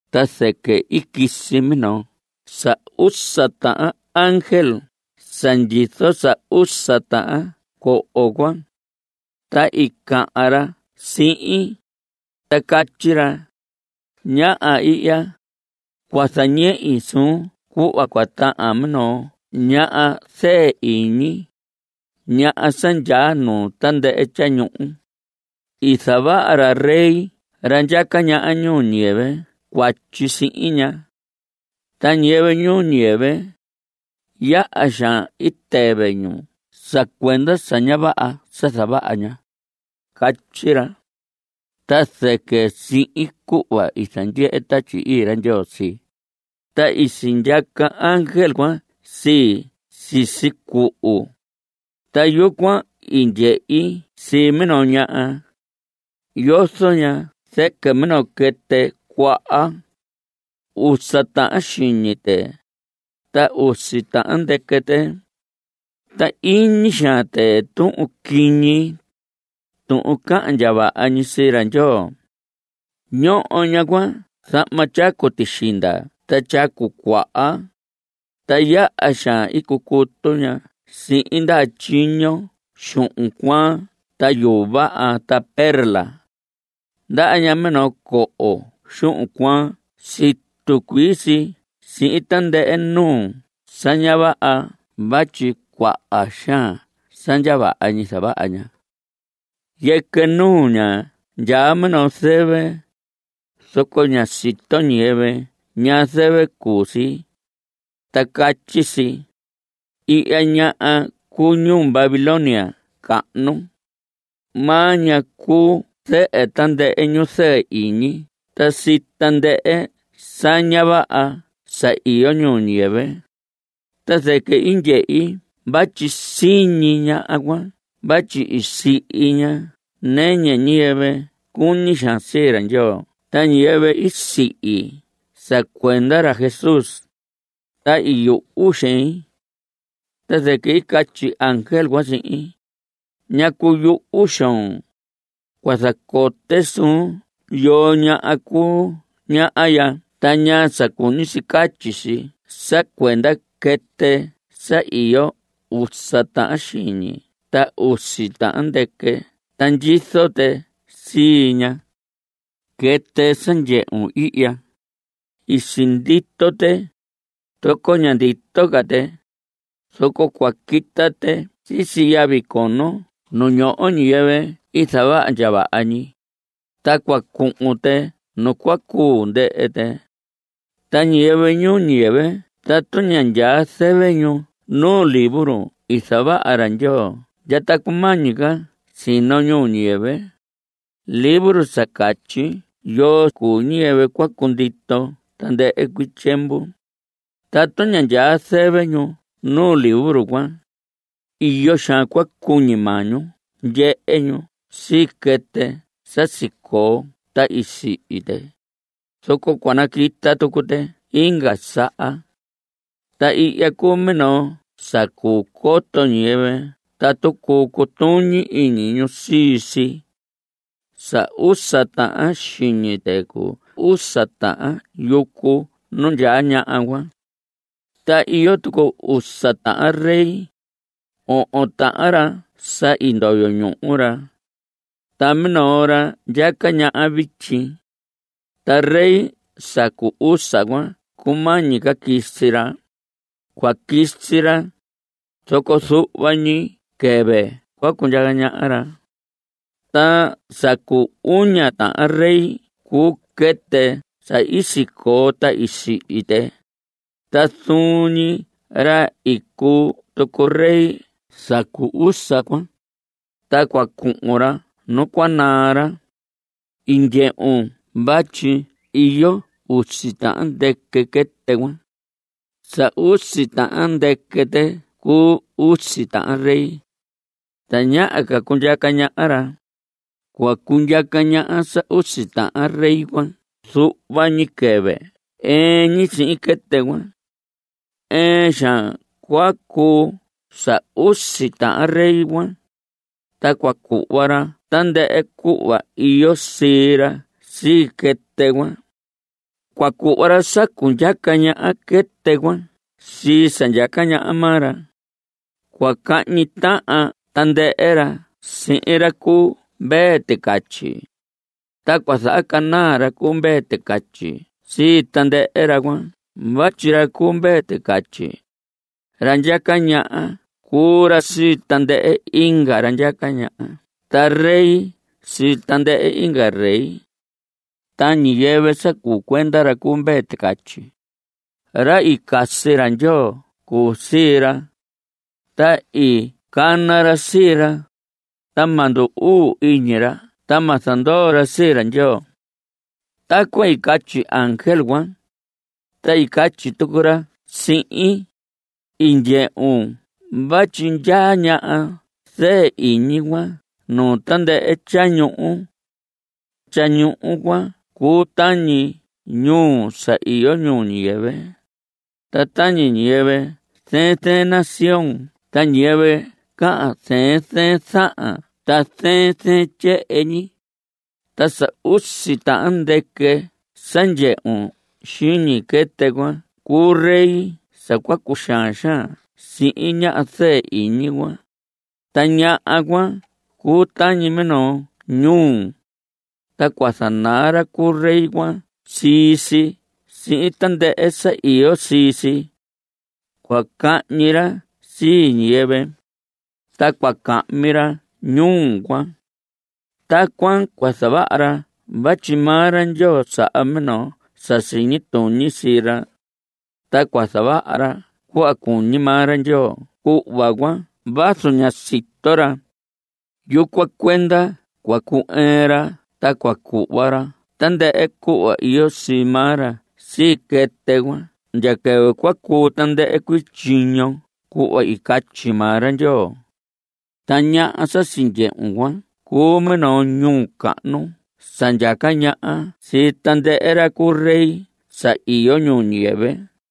Ta zɨquɨ i quisi minoo sa usa tahan ángel sa ndyizo sa usa tahan coho cuan, ta i cahan ra sihin, ta catyi ra: Ñaha ihya. Cua zañehi suun cuhva cua tahan minoo ñaha zɨɨ iñi, ñaha sa ndyaa nuu tandɨhɨ tyañuhu. I zavaha ra rey ra ndyaca ñaha ñuu ñiyɨvɨ cuatyi sihin ña. Ta ñiyɨvɨ ñuu ñiyɨvɨ, yaha xaan i tɨvɨ ñu sa cuenda sa ña vaha sa zavaha ña. Catyi ra. Ta zɨquɨ sihin cuhva i zandyehe Tatyi Ii ra Ndyoo sii, ta i sindyaca ángel cuan sii sisi cuhu, ta yucuan i ndyehi sii minoo ñaha. Yozo ña zɨquɨ minoo quɨtɨ cuaha. Usa tahan xiñi tɨ, ta usi tahan ndɨquɨ tɨ. Ta iñi xaan tɨ tuhun quiñi, tuhun cahan ndya vaha ñi sii ra Ndyoo. Ñoho ñaha cuan zahma tyacu tixinda ta tyacu cuaha, ta yaha xaan i cucutu ña sihin ndaha tyiño xuhun cuaan ta yuu vaha ta perla. Ndaha ña minoo coho xuhun cuaan situ cuii si sihin tandɨhɨ nuu sa ña vaha vatyi cuaha xaan sa ndya vaha ñi zavaha ña. Yɨquɨ nuu ña ndyaa minoo zɨvɨ, zoco ñá sito ñiyɨvɨ ñaa zɨvɨ cuu si, ta catyi si: “Ihya ñaha cuu ñuu Babilonia cahnu, maa ña cuu zɨhɨ tandɨhɨ ñu zɨɨ iñi ta sii tandɨhɨ sa ña vaha sa iyo ñuu ñiyɨvɨ.” Ta zɨquɨ i ndyehi vatyi siñi ñaha cuan vatyi i sihi ña nɨñɨ ñiyɨvɨ cuñi xaan sii ra Ndyoo ta ñiyɨvɨ i sihi sa cuenda ra Jesús, ta i yuhu xein. Ta zɨquɨ i catyi ángel cuan sihin: ¿Ñacu yuhu xoon? Cua zacote suun yoo ña cuu ña ya ta ñaa sa cuñi si catyi si sa cuenda quɨtɨ sa iyo usa tahan xiñi ta usi tahan ndɨquɨ ta ndyizo tɨ sii ña. Quɨtɨ sa i ndyehun ihya, i sindito tɨ, zoco ña ndito ca tɨ, zoco cua quita tɨ sisi yavi cono ñu ñoho ñiyɨvɨ i zavaha ndya vaha ñi, ta cua cuhun tɨ nu cua cuu ndɨhɨ tɨ. Ta ñiyɨvɨ ñuu ñiyɨvɨ tatu ña ndyaa zɨvɨ ñu nu libro i zavaha ra Ndyoo ndya ta cumañi ca sino ñuu ñiyɨvɨ, libro sa catyi yoo cuu ñiyɨvɨ cua cundito tandɨhɨ cuii tyiemvu, tatu ña ndyaa zɨvɨ ñu nuu libro cuan, iyo xaan cua cuñi maa ñu ndyehe ñu sii quɨtɨ sa sicoo ta i sihi tɨ, zoco cua naquita tucu tɨ inga saha. Ta ihya cuu minoo sa cuu coto ñiyɨvɨ tatu cuu cutuñi iñi ñu sii si. Sa usa tahan xiñi tɨ cuu usa tahan yucu nu ndyaa ñaha cuan. Ta iyo tucu usa tahan rey. Ohon tahan ra sa i ndoyo ñuhu ra, ta minoo ra ndyaca ñaha vityi. Ta rey sa cu usa cuan cumañi ca quisi ra. Cua quisi ra, zoco zuhva ñi quɨvɨ cua cundyaca ñaha ra. Ta sa cu uña tahan rey cuu quɨtɨ sa i sicoo ta i sihi tɨ, ta zuun ñi ra i cuu tucu rey sa cu usa cuan, ta cua cuhun ra nu cua naa ra. I ndyehun vatyi iyo usi tahan ndɨquɨ quɨtɨ cuan. Sa usi tahan ndɨquɨ tɨ cuu usi tahan rey. Tañaha ca cundyaca ñaha ra. Cua cundyaca ñaha sa usi tahan rey cuan zuhva ñi quɨvɨ ɨɨn ñi sihin quɨtɨ cuan. Ɨɨn xaan cua cuu sa usi tahan rey cuan, ta cua cuhva ra tandɨhɨ cuhva iyo sii ra sii quɨtɨ cuan. Cua cuhva ra sa cundyaca ñaha quɨtɨ cuan sii sa ndyaca ñaha maa ra. Cua cahñi tahan tandɨhɨ ra sihin ra cu Mvee Ticatyi, ta cua zahacanaa ra cu Mvee Ticatyi sii tandɨhɨ ra cuan vatyi ra cu Mvee Ticatyi, ra ndyaca ñaha cuu ra sii tandɨhɨ inga ra ndyaca ñaha ta rey sii tandɨhɨ inga rey. Ta ñiyɨvɨ sa cuu cuenda ra cu Mvee Ticatyi, ra i casi ra Ndyoo cuu sii ra, ta i cana ra sii ra, ta ma ndu‑uu iñi ra ta ma zandoo ra sii ra Ndyoo. Tacuan i catyi ángel cuan, ta i catyi tucu ra sihin: I ndyehun vatyi ndyaa ñaha zɨɨ iñi cuan nuu tandɨhɨ tyañuhu. Tyañuhu cuan cuu tañi ñuu sa iyo ñuu ñiyɨvɨ, ta tañi ñiyɨvɨ zɨɨn zɨɨn nación ta ñiyɨvɨ cahan zɨɨn zɨɨn zahan ta zɨɨn zɨɨn tyehen ñi. Ta sa usi tahan ndɨquɨ sa ndyehun xiñi quɨtɨ cuan cuu rey sa cua cuxaan xaan sihin ñaha zɨɨ iñi cuan, ta ñaha cuan cuu tañi minoo ñuu, ta cua zanaa ra cu rey cuan sii si sihin tandɨhɨ sa iyo sii si. Cua cahñi ra sii ñiyɨvɨ, ta cua cahmi ra ñuu cuan. Tacuan cua zavaha ra vatyi maa ra Ndyoo saha minoo sa siñi tuñi sii ra, ta cua zavaha ra cuhva cuñi maa ra Ndyoo cuhva cuan vazu ña sito ra. Yucuan cuenda cua cu‑ɨɨn ra ta cua cuhva ra tandɨhɨ cuhva iyo sii maa ra sii quɨtɨ cuan ndya quɨvɨ cua cuu tandɨhɨ cuii tyiño cuhva i catyi maa ra Ndyoo. Ta ñaha sa sindyehun cuan cuu minoo ñuu cahnu sa ndyaca ñaha sii tandɨhɨ ra cu rey sa iyo ñuu ñiyɨvɨ.